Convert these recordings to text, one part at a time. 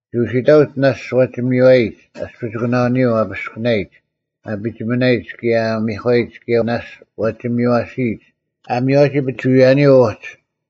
ᒋ ᐅᓯᑕᐅᒡ ᓇᔅᒡ ᐛᒋ ᒥᔽᓯᔨᒡ ᐊᔅᐱᒋᑯᓇᐅᓂᔪᐤ ᐊ ᐱᔅᑭᓇᔨᒡ, ᐊ ᐱᒋᒥᓇᔨᒡ ᑭᔭ ᐊ ᒥᒂᔨᒡ ᑭᔭ ᓇᔅᒡ ᐛᒋ ᒥᔽᓯᔨᒡ ᐊ ᒥᔽᔨᒋ ᐱᒍᐎᔭᓂᔪᐤ ᐅᒡ᙮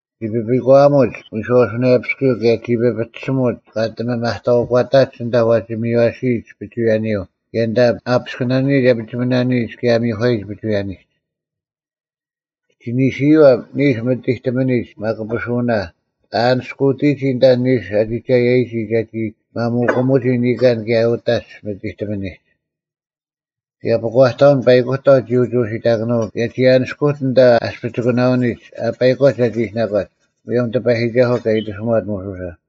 ᒋ ᐱᐱᒂᐊᒧᒡ ᐎᔄᐅᓱᓇᔭᐱᔅᑯᔪᐤ ᑭᔭ ᒋ ᐱᐱᒋᓯᒧᒡ ᒂ ᐊᑎ ᒥᒪᑕᐅᒂᑕᒡ ᐊᓐᑕ ᐛᒋ ᒥᔽᓯᔨᒡ ᐱᒍᐎᔭᓂᔪᐤ ᑭᔭ ᐊᓐᑕ ᐊ ᐱᔅᑭᓂᓇᔨᒡ, ᐊ ᐱᒋᒪᓇᔨᒡ ᑭᔭ ᐊ ᒥᒂᔨᒡ ᐱᒍᐎᔭᓂᒡ᙮ ᒋ ᓂᓯᓂᔪᐛ ᓂᓱ ᒥᑎᑎᒥᓂᒡ ᒪᑯᐱᓱᐅᓇ ᐊᓂᔅᑯᑎᒋ ᐊᓐᑕ ᓂᓱ ᐊ ᒋᒐᔭᒋ ᒐᒋ ᒪᒧᑯᒧᒋ ᓂᑲᓐ ᑭᔭ ᐅᑕᒡ ᒥᑎᑎᒥᓂᒡ᙮ ᑭᔭ ᐱᒂᑕᐅᓐ ᐸᐃᑯᑕᐤ ᒋᑭ ᐅᒋ ᐅᓯᑕᑭᓄᐤ ᑭᔭ ᒐ ᐊᓂᔅᑯᑎᓐ ᐊᓐᑕ ᐊᔅᐱᒋᑯᓇᐅᓂᒡ ᐊ ᐸᐃᒂᒡ ᒐᒋ ᐃᓯᓇᒂᒡ, ᒧᔭᒻ ᑎᐸᔨᒋᒐᓱᐤ ᑲ ᐃᑎᓱᒪᑦ ᒧᓱᓴ᙮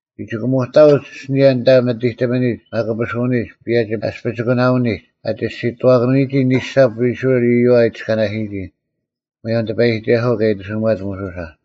ᒋ ᒋᑭᒧᑕᐅᒡ ᐊᓯᓂᔭ ᐊᓐᑕ ᒥᑎᑎᒥᓂᒡ ᒪᑯᐱᓱᐅᓂᒡ ᐸᔭᒋ ᐊᔅᐱᒋᑯᓇᐅᓂᒡ ᐊ ᒋᔅᒋᑐᐛᑭᓄᐎᒋ ᓂᓴᑉ ᐃᔅᕋᐃᓪ ᐃᔪᐛ ᐊ ᐃᑎᔅᑲᓇᓯᔨᒋ, ᒧᔭᒻ ᑎᐸᔨᒋᒐᓱᐤ ᑲ ᐃᑎᓱᒪᑦ ᒧᓱᓴ᙮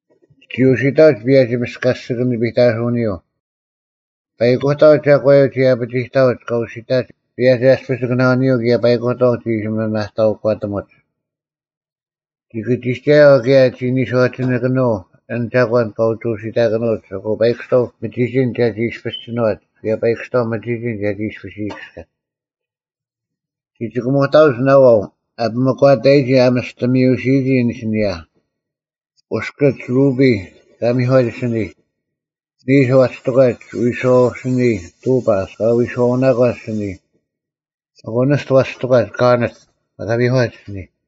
ᒋ ᐅᓯᑕᐅᒡ ᐸᔭᒋ ᒥᔅᑲᔅᒋᑭᓂ ᐱᑕᓱᐅᓂᔪᐤ᙮ ᐸᐃᑯᑕᐤ ᒐᒂᔪᐤ ᒋ ᐊᐱᒋᑕᐅᒡ ᑲ ᐅᓯᑕᒡ ᐸᔭᒋ ᐊᔅᐱᒋᑯᓇᐅᓂᔪᐤ ᑭᔭ ᐸᐃᑯᑕᐤ ᒋ ᐃᓯ ᒥᒪᑕᐅᒂᑎᒧᒡ᙮ ᒋ ᑭᒋᒐᔭᐤ ᑭᔭ ᒋ ᓂᔄᒋᓇᑭᓄᐤ ᐊᓐ ᒐᒂᓐ ᑲ ᐅᒋ ᐅᓯᑕᑭᓄᐅᒡ ᐊᑯ ᐸᐃᑯᔅᑕᐤ ᒥᒋᒋᓐ ᒐᒋ ᐃᔅᐱᔅ ᒋᓏᒡ ᑭᔭ ᐸᐃᑯᔅᑕᐤ ᒥᒋᒋᓐ ᒐᒋ ᐃᔅᐱᔅ ᐃᔨᑭᔅᑲᒡ᙮ ᒋ ᒋᑭᒧᑕᐅᒡ ᓇᐛᐤ ᐊᐱᒧᒂᑕᔨᒋ ᐊ ᒥᔅᑎ ᒥᔪᓯᓯᔨᒋ ᐊᓯᓂᔭ: ᐅᔅᑭᒡ ᕈᐱᔾ (ᑲ ᒥᒂᒡ ᐊᓯᓂᔾ), ᓂᓱ ᐛᒋ ᑎᒂᒡ ᐎᔄᐅᐤ ᐊᓯᓂᔾ ᑐᐸᔅ (ᑲ ᐎᔄᐅᓇᒂᒡ ᐊᓯᓂᔾ), ᐊᑯ ᓂᔅᑐ ᐛᒋ ᑎᒂᒡ ᑲᐊᕐᓂᑦ (ᑲ ᒥᒂᒡ ᐊᓯᓂᔾ)᙮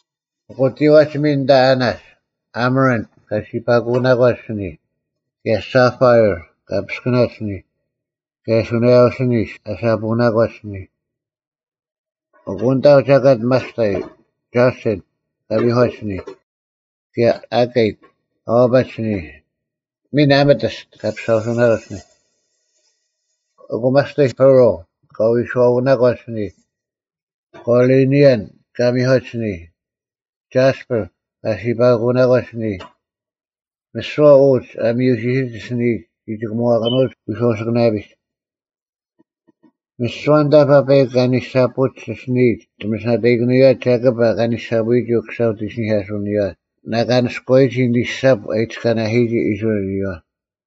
ᐊᑯ ᑎᐛᒡ ᒥᓐ ᐊᓐᑕ ᐊᓇᒡ, ᐊᒥᕋᓪᑦ (ᑲ ᓯᐸᑯᓇᒂᒡ ᐊᓯᓂᔾ), ᑭᔭ ᓴᐸᐃᕐ (ᑲ ᐱᔅᑭᓇᒂᒡ ᐊᓯᓂᔾ), ᑭᔭ ᓱᓇᔭᐤ ᐊᓯᓂᔅ (ᐊ ᓴᐳᓇᒂᒡ ᐊᓯᓂᔾ)᙮ ᐊᑯ ᐊᓐᑕ ᒐᑲᑦ ᒪᔅᑕᔾ: ᒐᓴᓐᑦ (ᑲ ᒥᒂᒡ ᐊᓯᓂᔾ), ᑭᔭ ᐊᑲᑦ (ᑲ ᐛᐸᒡ ᐊᓯᓂᔾ), ᒥᓐ ᐊᒪᑎᔅᑦ (ᑲ ᐸᔅᒍᓴᐅᓇᒂᒡ ᐊᓯᓂᔾ)᙮ ᐊᑯ ᒪᔅᑕᔾ, ᐸᕆᓪ (ᑲ ᐎᔄᐅᓇᒂᒡ ᐊᓯᓂᔾ), ᑲᕐᓂᓕᔭᓐ (ᑲ ᒥᒂᒡ ᐊᓯᓂᔾ), ᒐᔅᐸᕐ (ᑲ ᓯᐸᑯᓇᒂᒡ ᐊᓯᓂᔾ)᙮ ᒥᓯᐛ ᐅᒡ ᐊ ᒥᔪᓯᓯᒡ ᐊᓯᓂᔨᒡ ᒋ ᒋᑭᒺᑭᓄᐎᒡ ᐎᔄᐅᐤ ᐊᓯᑭᓇᔭᐱᔨᒡ᙮ ᒥᓯᐛ ᐊᓐᑕ ᐸᐸᐃᒄ ᐊᓂᓴᐳᒡ ᐊᓯᓂᔨᒡ ᒋ ᒥᓯᓇᑕᐃᑭᓄᔪᐛ ᒐᑭᑉ ᑲ ᓂᓴᐳᔨᒋ ᐅᑯᓴ ᐅᑦ ᐃᓯᓂᐧᑲᓱᐅᓂᔨᐛ ᓇᑲᓂᔅᑯᐛᔨᒋ ᓂᓴᑉ ᐊ ᐃᑎᔅᑲᓇᓯᔨᒋ ᐃᔅᕋᐃᓪ ᐃᔪᐛ᙮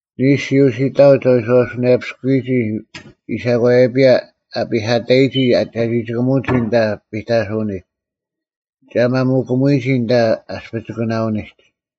ᓂᓱ ᒋ ᐅᓯᑕᐅᒡ ᐊ ᐎᔄᐅᓱᓇᔭᐱᔅᑯᐅᒋ ᐃᓴᒂᔭᐱᔭ ᐊ ᐱᐧᑲᑕᔨᒋ ᒐ ᒋᑭᒧᒋ ᐊᓐᑕ ᐱᑕᓱᐅᓂᒡ᙮ ᒐ ᒪᒧᑭᒧᐎᔨᒋ ᐊᓐᑕ ᐊᔅᐱᒋᑯᓇᐅᓂᒡ᙮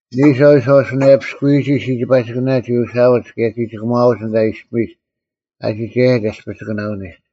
ᓂᓱ ᐊ ᐎᔄᐅᓱᓇᔭᐱᔅᑯᐅᒋ ᓯᒋᐸᒋᑭᓇ ᒋ ᐅᓯᐊᐅᒡ ᑭᔭ ᒋ ᒋᑭᒺᐅᒡ ᐊᓐᑕ ᐃᔅᐱᒥᒡ ᐊ ᒋᒐᔭᒡ ᐊᔅᐱᒋᑯᓇᐅᓂᒡ᙮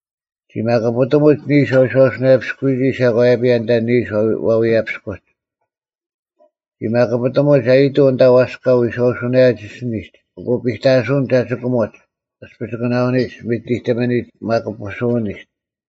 ᒋ ᒪᑯᐱᑎᒧᒡ ᓂᓱ ᐊ ᐎᔄᐛᐱᔅᑯᔨᒋ ᐃᓴᒂᔭᐱᔭ ᐊᓐᑕ ᓂᓱ ᐛᐎᔭᐱᔅᑯᒡ᙮ ᒋ ᒪᑯᐱᑎᒧᒡ ᐊᔨᑐᐤ ᐊᓐᑕ ᐛᔅᑲ ᐎᔄᐅᓱᓇᔭᒡ ᐊᓯᓂᒡ ᐊᑯ ᐱᑕᓱᐅᓐ ᒐ ᒋᑭᒧᒡ ᐊᔅᐱᒋᑯᓇᐅᓂᒡ ᒥᑎᑎᒥᓂᒡ ᒪᑯᐱᓱᐅᓇᓂᒡ᙮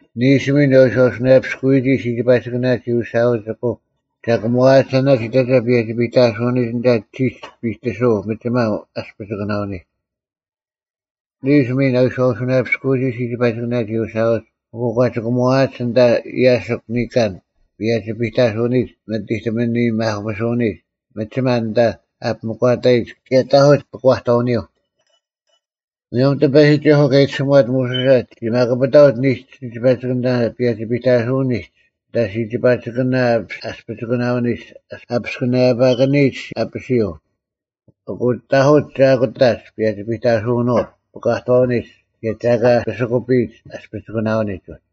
ᓂᓱ ᒥᓐ ᐊ ᐎᔄᐅᓱᓇᔭᐱᔅᑯᐅᒋ ᓯᒋᐸᒋᑭᓇ ᒋ ᐅᓯᐊᐅᒡ ᐊᑯ ᒐ ᑭᒺᐊᒡ ᐊᓇᒡ ᐃᑕᒐ ᐸᔭᒋ ᐱᑕᓱᐅᓄᑎᒡ ᐊᓐᑕ ᒋᒡ ᐱᑎᓱᐤ ᒥᒋᒪ ᐊᔅᐱᒋᑯᓇᐅᓂᒡ᙮ ᓂᓱ ᒥᓐ ᐊ ᐎᔄᐅᓱᓇᔭᐱᔅᑯᐅᒋ ᓯᒋᐸᒋᑭᓇ ᒋ ᐅᓯᐊᐅᒡ ᐊᑯ ᒂ ᒋᑭᒧᐛᒡ ᐊᓐᑕ ᔭᓯᒄ ᓂᑲᓐ ᐸᔭᒋ ᐱᑕᓱᐅᓂᒡ ᒥᑎᑎᒥᓂ ᒪᑯᐱᓱᐅᓂᒡ ᒥᒋᒪ ᐊᓐᑕ ᐊᐱᒥᒂᑕᔨᒡ ᑭᔭ ᑕᐧᑯᒡ ᐱᒂᑕᐅᓂᔪᐤ᙮ ᒧᔭᒻ ᑎᐸᔨᒋᒐᓱᐤ ᑲ ᐃᑎᓱᒪᑦ ᒧᓱᓴ, ᒋ ᒪᑯᐱᑕᐅᒡ ᓂᓱ ᓯᒋᐸᒋᑭᓇ ᐸᔭᒋ ᐱᑕᓱᐅᓂᒡ ᐊᓐᑕ ᓯᒋᐸᒋᑭᓇ ᐊᔅᐱᒋᑯᓇᐅᓂᒡ ᐊᐱᔅᑭᓇᐸᑭᓂᔨᒡ ᐊᐱᓯᔪᐤ, ᐊᑯ ᑕᐧᑯᒡ ᒐ ᐊᑯᑕᒡ ᐸᔭᒋ ᐱᑕᓱᐅᓄᐅᑦ ᐱᒂᑕᐅᓂᒡ ᑭᔭ ᒐ ᐊᑲ ᐱᓯᑯᐱᔨᒡ ᐊᔅᐱᒋᑯᓇᐅᓂᒡ ᐅᒡ᙮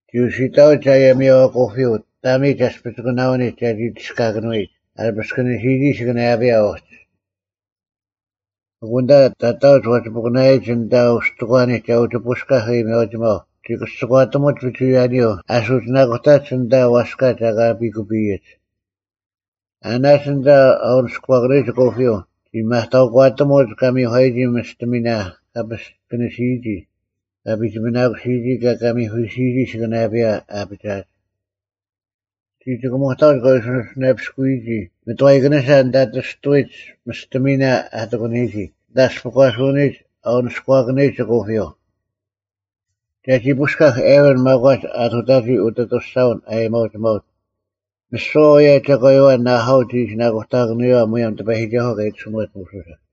ᒋ ᐅᓯᑕᐅᒡ ᐊᔭᒥᐊᐤ ᐊᑯᐱᔪᐤ ᑕᒥᒡ ᐊᔅᐱᒋᑯᓇᐅᓂᒡ ᒐᒋ ᒋᔅᑲᑭᓄᐎᔨᒡ ᐊ ᐱᔅᑭᓂᓯᔨᒋ ᐊᓯᑭᓂᔭᐱᔭ ᐅᒋ᙮ ᐊᑯ ᐊᓐᑕ ᑕᑕᐅᒡ ᐛᒋ ᐱᑯᓇᐃᔨᒡ ᐊᓐᑕ ᐅᔅᑎᒂᓂᒡ ᒐ ᐅᒋ ᐳᔅᑲᐧᒃ ᐊᔭᒥᐊᐅᒋᒪᐤ ᒋ ᑭᔅᒋᒂᑎᒧᒡ ᐱᒍᐎᔭᓂᔪᐤ ᐊ ᓱᒋᓇᑯᑕᒡ ᐊᓐᑕ ᐛᔅᑲ ᒐ ᐊᑲ ᐱᑯᐱᔨᒡ᙮ ᐊᓇᒡ ᐊᓐᑕ ᐊ ᐅᓂᔎᑭᓂᔨᒡ ᐊᑯᐱᔪᐤ ᒐ ᒥᒪᑕᐅᒂᑎᒧᒡ ᑲ ᒥᒂᔨᒋ ᒥᔅᑎᒥᓇ ᑲ ᐱᔅᑭᓂᓯᔨᒋ, ᑲ ᐱᒋᒥᓇᑯᓯᔨᒋ, ᑭᔭ ᑲ ᒥᐧᑯᓯᔨᒋ ᐊᓯᑭᓇᔭᐱᔭ ᐊᐱᒋᐊᒡ᙮ ᒋ ᒋᑭᒧᑕᐅᒡ ᑲ ᐎᔄᐅᓱᓇᔭᐱᔅᑯᐎᒋ ᒥᑥᐃᑭᓂᓴ ᐊᓐᑕ ᑎᔅᑐᐎᒡ ᒥᔅᑎᒥᓇ ᐊ ᑎᑯᓂᔨᒋ ᐊᓐᑕ ᐊᔅᐱᒂᓱᐅᓂᒡ ᐊ ᐅᓂᔎᑭᓂᔨᒡ ᐊᑯᐱᔪᐤ᙮ ᒐᒋ ᐳᔅᑲᐧᒃ ᐊᕈᓐ ᒪᒂᒡ ᐊᑐᑕᒋ ᐅᑦ ᐊᑐᔅᒐᐅᓐ ᐊᔭᒥᐊᐅᒋᒪᐅᑦ᙮ ᒥᓯᐛ ᐅᔭ ᒐᒂᔪᐛ ᓇᐊᐤ ᒋ ᐃᓯᓇᑯᑕᑭᓄᔪᐛ ᒧᔭᒻ ᑎᐸᔨᒋᒐᓱᐤ ᑲ ᐃᑎᓱᒪᑦ ᒧᓱᓴ᙮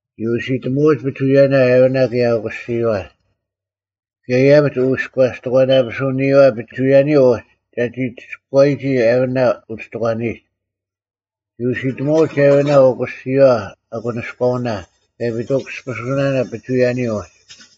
ᒋ ᐅᓯᑎᒧᐛᐅᒡ ᐱᒍᐎᔭᓇ ᐊᕋᓇ ᑭᔭ ᐅᑯᓯᔨᐛ᙮ ᑭᔭ ᐃᔭᐱᒡ ᐅᐎᔎᔭᔅᑎᒂᓇᐱᓱᐅᓂᔨᐛ ᐱᒍᐎᔭᓂᔪᐤ ᐅᒡ ᒐᒋ ᒋᔅᑯᐛᔨᒋ ᐊᕈᓇ ᐅᔅᑎᒂᓂᔨᒡ᙮ ᒋ ᐅᓯᑎᒧᐛᐅᒡ ᐊᕈᓇ ᐅᑯᓯᔨᐛ ᐊᑯᓂᔎᐅᓇ ᑭᔭ ᐱᑐᑭᔅᒋᐱᓱᓇᓇ ᐱᒍᐎᔭᓂᔪᐤ ᐅᒡ᙮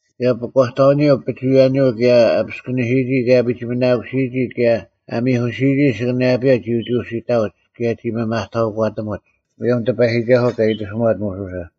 ᑭᔭ ᐱᒂᑕᐅᓂᔪᐤ ᐱᒍᐎᔭᓂᔪᐤ ᑭᔭ ᐊ ᐱᔅᑭᓂᓯᔨᒋ, ᐊ ᐱᒋᒥᓇᑯᔨᒋ ᑭᔭ ᐊ ᒥᐧᑯᓯᔨᒋᑦ ᐊᓯᑭᓂᔭᐱᔭ ᒋ ᐅᒋ ᐅᓯᑕᐅᒡ ᑭᔭ ᒋ ᒥᒪᑕᐅᒂᑎᒧᒡ, ᒧᔭᒻ ᑎᐸᔨᒋᒐᓱᐤ ᑲ ᐃᑎᓱᒪᑦ ᒧᓱᓴ᙮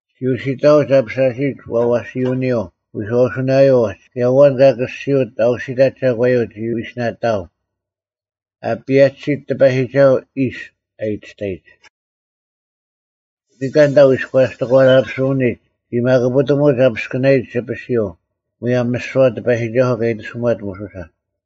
ᒋ ᐅᓯᑕᐅᒡ ᐊᐱᓴᓯᔨᒡ ᐛᐛᓯᐅᓂᔪᐤ ᐎᔄᐅᓱᓇᔭᔪᐤ ᐅᒡ ᑭᔭ ᐊᐛᓐ ᑲ ᑭᔅᒋᐅᑦ ᐊᐅᓯᑕᑦ ᒐᒂᔪᐤ ᒋ ᐎᓯᓇᑕᐊᒻ, “ᐊ ᐸᔭᒋᓯᑦ ᑎᐸᔨᒋᒐᓱᐛ ᐃᔅ,” ᐊ ᐃᑎᔅᑕᔨᒡ᙮ ᓂᑲᓐ ᐊᓐᑕ ᐅᐎᔎᔭᔅᑎᒂᓇᐱᓱᐅᓂᔨᒡ ᒋ ᒪᑯᐱᑎᒧᒡ ᐊ ᐱᔅᑭᓇᔨᒡ ᐊᐱᓯᔪᐤ ᒧᔭᒻ ᒥᓯᐛ ᑎᐸᔨᒋᒐᓱᐤ ᑲ ᐃᑎᓱᒪᑦ ᒧᓱᓴ᙮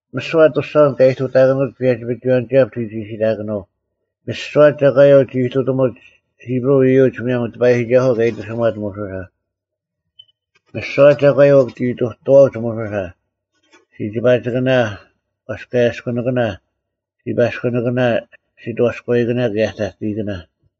ᒥᓯᐛ ᐊᑐᔅᒐᐅᓐ ᑲ ᐃᑐᑕᑭᓄᐅᒡ ᐸᔭᒋ-ᐱᒍᐎᔭᓂᒋᐛᑉ ᒋ ᒋᓯᑕᑭᓄᐤ᙮ ᒥᓯᐛ ᒐᒂᔪᐤ ᒋ ᐃᑐᑎᒥᒡ ᐃᑉᕈᐤ ᐃᔪᒡ ᒧᔭᒻ ᑎᐸᔨᒋᒐᓱᐤ ᑲ ᐃᑎᓱᒪᑦ ᒧᓱᓴ᙮ ᒥᓯᐛ ᒐᒂᔪᐤ ᒋ ᐃᑐᑐᐛᐅᒡ ᒧᓱᓴ: ᓯᒋᐸᒋᑭᓇ, ᐛᔅᑲᔭᔅᑯᓂᑭᓇ, ᓯᐸᔅᑯᓂᑭᓇ, ᓯᑥᔎᐃᑭᓇ ᑭᔭ ᑕᑕᐃᑭᓇ᙮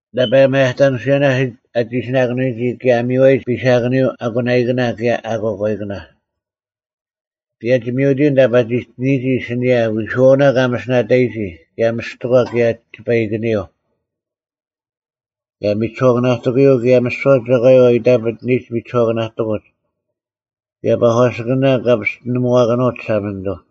ᓇᐸ ᒪᔭᑕᓂᓱᔭᓇ ᐊ ᒋᓯᓇᑭᓄᔨᒋ ᑭᔭ ᐊ ᒥᔽᔨᒡ ᐱᓴᑭᓂᔪᐤ ᐊᑯᓇᐃᑭᓇ ᑭᔭ ᐊᑯᐛᑲᐃᑭᓇ, ᐸᔭᒋ-ᒥᐅᑎᔪᐤ ᐊᓐᑕ ᐸᒋᑎᓂᔨᒋ ᐊᓯᓂᔭ ᐎᓱᐛᐅᓇ ᑲ ᒥᓯᓇᑕᔨᒋ ᑭᔭ ᒥᔅᑎᒂ ᑭᔭ ᒋᐸᐃᑭᓂᔪᐤ; ᑭᔭ ᒥᒋᓱᐛᑭᓇᑎᑯᔪᐤ ᑭᔭ ᒥᓯᐛ ᒐᒂᔪᐤ ᐊ ᐃᑕᐱᑎᓂᔨᒡ ᒥᒋᓱᐛᑭᓇᑎᑯᒡ ᑭᔭ ᐸᒂᓯᑭᓇ ᑲ ᐱᔅᑎᓂᒧᐛᑭᓄᐅᑦ ᒋᓴᒪᓂᑐᐤ;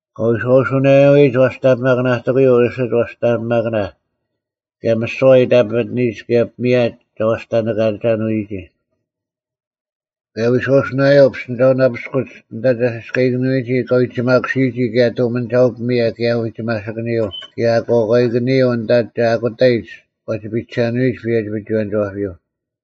ᑲ ᐎᔄᐅᓱᓇᔭᐅᔨᒡ ᐛᔅᑕᓂᐱᒪᑭᓇᑎᑯᔪᐤ ᐊᓯᒡ ᐛᔅᑕᓂᐱᒪᑭᓇ, ᑭᔭ ᒥᓯᐛ ᐊ ᐃᑕᐱᑎᓂᔨᒡ ᑭᔭ ᐱᒥᔭ ᒐ ᐛᔅᑕᓂᑲᐛᒐᓄᐎᒋ; ᑭᔭ ᐎᔄᐅᓱᓇᔭᐤ ᐱᔅᑎᓂᒐᐅᓇᐱᔅᒄ ᐊᓐᑕ ᒐ ᓯᔅᑲᐃᑭᓂᔨᒋ ᑲ ᐎᒋᒪᑯᓯᔨᒋ ᑭᔭ ᑐᒥᓂᒐᐅ-ᐱᒥᔭ ᑭᔭ ᐎᒋᒪᓯᑭᓂᔪᐤ, ᑭᔭ ᐊᑯᐛᑲᐃᑭᓂᔪᐤ ᐊᓐᑕ ᒐ ᐊᑯᑕᔨᒡ ᐛᒋ ᐱᔨᒐᓄᐎᒡ ᐸᔭᒋ-ᐱᒍᐎᔭᓂᒋᐛᐱᔪᐤ᙮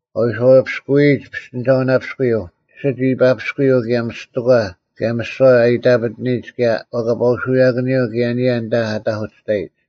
ᑲ ᐎᔄᐛᐱᔅᑯᔨᒡ ᐱᔅᑎᓂᒐᐅᓇᐱᔅᑯᔪᐤ ᐊᓯᒡ ᐃᐸᐱᔅᑯᔪᐤ ᑭᔭ ᒥᔅᑎᒂ ᑭᔭ ᒥᓯᐛ ᐊ ᐃᑕᐱᑎᓂᔨᒡ ᑭᔭ ᐛᐸᑲᐅᓱᔭᑭᓂᔪᐤ ᑭᔭ ᐊᓂᔭ ᐊᓐᑕ ᐊ ᑕᐧᑯᑎᔅᑕᔨᒡ᙮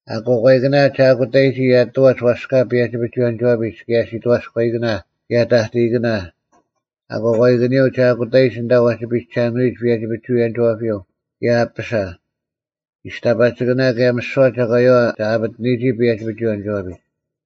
ᐊᑯᐛᑲᐃᑭᓇ ᒐ ᐊᑯᑕᔨᒋ ᐊᑐᐛᒡ ᐛᔅᑲ ᐸᔭᒋ-ᐱᒍᐎᔭᓂᒋᐛᐱᒡ ᑭᔭ ᓯᑥᔎᐃᑭᓇ ᑭᔭ ᑕᑕᐃᑭᓇ, ᐊᑯᐛᑲᐃᑭᓂᔪᐤ ᒐ ᐊᑯᑕᔨᒡ ᐊᓐᑕ ᐛᒋ ᐱᒐᓄᐎᒡ ᐸᔭᒋ-ᐱᒍᐎᔭᓂᒋᐛᐱᔪᐤ ᑭᔭ ᐊᐱᓴ, ᒋᔅᑕᐸᒋᑭᓇ ᑭᔭ ᒥᓯᐛ ᒐᒂᔪᐛ ᒐ ᐊᐱᑎᓂᔨᒋ ᐸᔭᒋ-ᐱᒍᐎᔭᓂᒋᐛᐱᒡ᙮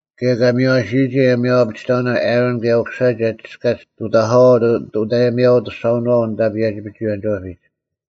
ᑭᔭ ᑲ ᒥᔽᓯᔨᒋ ᐊᔭᒥᐅ-ᐊᐱᒋᑕᐅᓇ ᐊᕋᓐ ᑭᔭ ᐅᑯᓴ ᒐ ᒋᔅᑲᒡ ᑐᑕᐧᑲᐛ ᐅᑦ ᐊᔭᒥᐊᐅ-ᐊᑐᔅᒐᐅᓄᐛᐤ ᐊᓐᑕ ᐸᔭᒋ-ᐱᒍᐎᔭᓂᒋᐛᐱᒡ᙮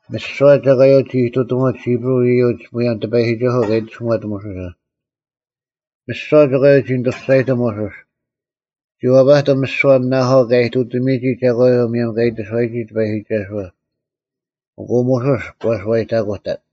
ᒥᓯᐛ ᒐᒂᔪᐤ ᒋ ᐃᑐᑎᒥᒡ ᐃᑉᕈᐤ ᐃᔪᒡ ᒧᔭᒻ ᑎᐸᔨᒋᒐᓱᐤ ᑲ ᐃᑎᓱᒪᑦ ᒧᓱᓴ᙮ ᒥᓯᐛ ᒐᒂᔪᐤ ᒋ ᓂᑐ ᒋᔅᒐᔨᑎᒻ ᒧᓱᔅ, ᒋ ᐛᐱᑎᒻ ᒥᓯᐛ ᓇᐊᐤ ᑲ ᐃᑐᑎᒥᔨᒋ ᒐᒂᔪᐤ ᒧᔭᒻ ᑲ ᐃᑎᓱᐛᔨᒋ ᑎᐸᔨᒋᒐᓱᐛ, ᐊᑯ ᒧᓱᔅ ᒂ ᓱᐛᔨᑕᑯᑕᑦ᙮